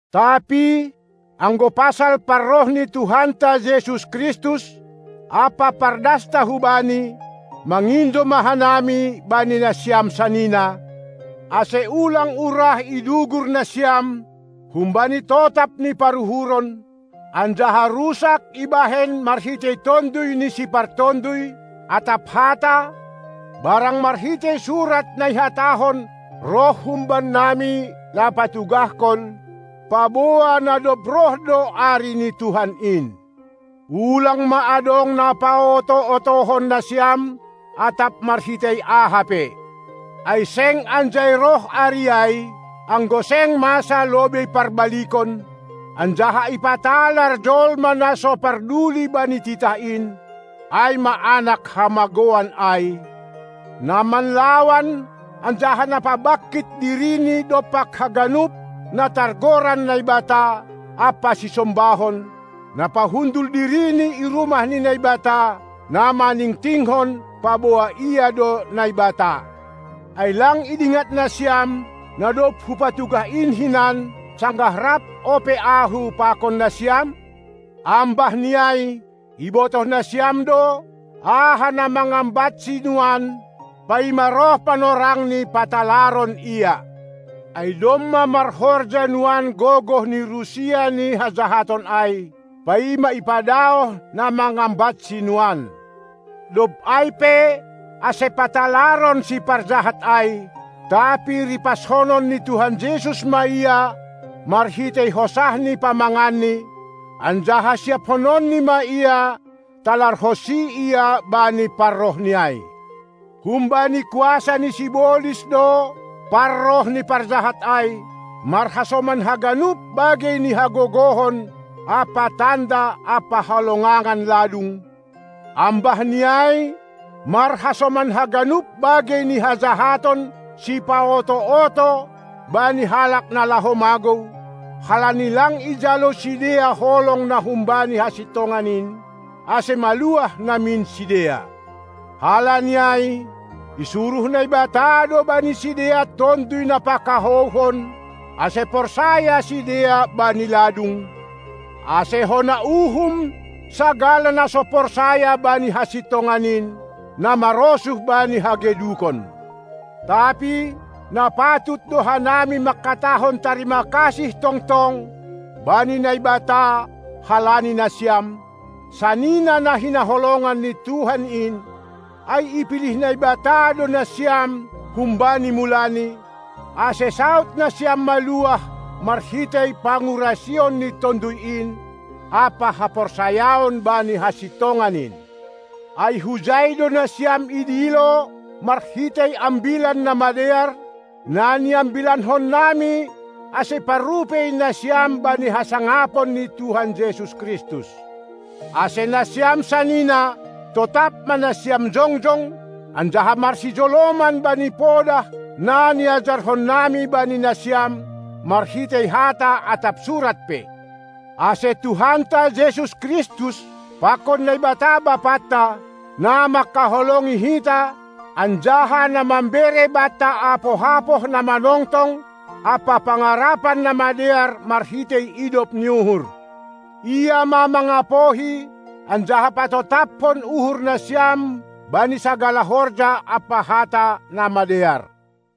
Tapi anggo pasal parroh ni Tuhanta Jesus Kristus ampa pardasta hu Bani, mangindo ma hanami, bani nasiam sanina, ase ulang urah idugur nasiam humbani totap ni paruhuron, anjaha rusak ibahen marhitei tonduy ni sipartonduy atap hata, barang marhitei surat na ihatahon roh humbannami, na patugahkon, paboa na dob roh do ari ni Tuhan in. Ulang ma adong na paoto-otohon nasiam atap marhitei aha pe. Ai seng anjai roh ari ai, anggo seng masa lobei parbalikon, anjaha ipatalar jolma na so parduli bani titah in, ai ma anak hamagouan ai, na manlawan anjaha na pabangkit dirini dompak haganup na targoran naibata ampa sisombahon, na pahundul dirini i rumah ni Naibata, na maningtingkon, paboa ia do naibata. Ai lang idingat nasiam, na dob hupatugah in hinan, sanggah rap ope ahu pakon nasiam? Ambahni ai, ibotoh nasiam do, aha na mangambatsi nuan, paima roh panorangni patalaron ia. Ai domma marhorja nuan gogoh ni rusia ni hajahaton ai, paima ipadaoh na mangambatsi nuan. Dob ai pe ase patalaron siparjahat ai, tapi ripashonon ni Tuhan Jesus ma ia marhitei hosah ni pamanganni, anjaha siaphononni ma ia talarhonsi Ia bani parrohNi ai. Humbani kuasa ni sibolis do parroh ni parjahat ai, marhasoman haganup bagei ni hagogohon ampa tanda ampa halongangan ladung, ambahni ai marhasoman haganup bagei ni hajahaton sipaoto-oto bani halak na laho magou, halani lang ijalo sidea holong na humbani hasintongan in, ase maluah namin sidea. Halani ai isuruh Naibata do bani sidea tonduy na pakahouhon, ase porsaya sidea bani ladung, ase hona uhum sagala na so porsaya bani hasintongan in, na marosuh bani hagedukon. Tapi na patut do hanami manghatahon tarima kasih tongtong bani Naibata halani nasiam, sanina na hinaholongan ni Tuhan in, ai ipilih Naibata do nasiam humbani mulani, ase saud nasiam maluah marhitei pangurasion ni Tonduy in ampa haporsayaon bani hasintongan in. Ai hujai do nasiam idilo marhitei Ambilan Namadear, na niambilankonnami, ase parrupei nasiam bani hasangapon ni Tuhan Jesus Kristus. Ase nasiam sanina, totap ma nasiam jongjong anjaha marsijoloman bani podah, na niajarhonnami bani nasiam, marhitei hata atap surat pe. Ase Tuhanta Jesus Kristus pakon Naibata Bapanta, na mangkaholongi hita anjaha na mambere banta apoh-apoh na manongtong ampa pangarapan namadear marhitei idop ni uhur, Ia ma mangapohi anjaha patotaphon uhur nasiam bani sagala horja ampa hata na madear.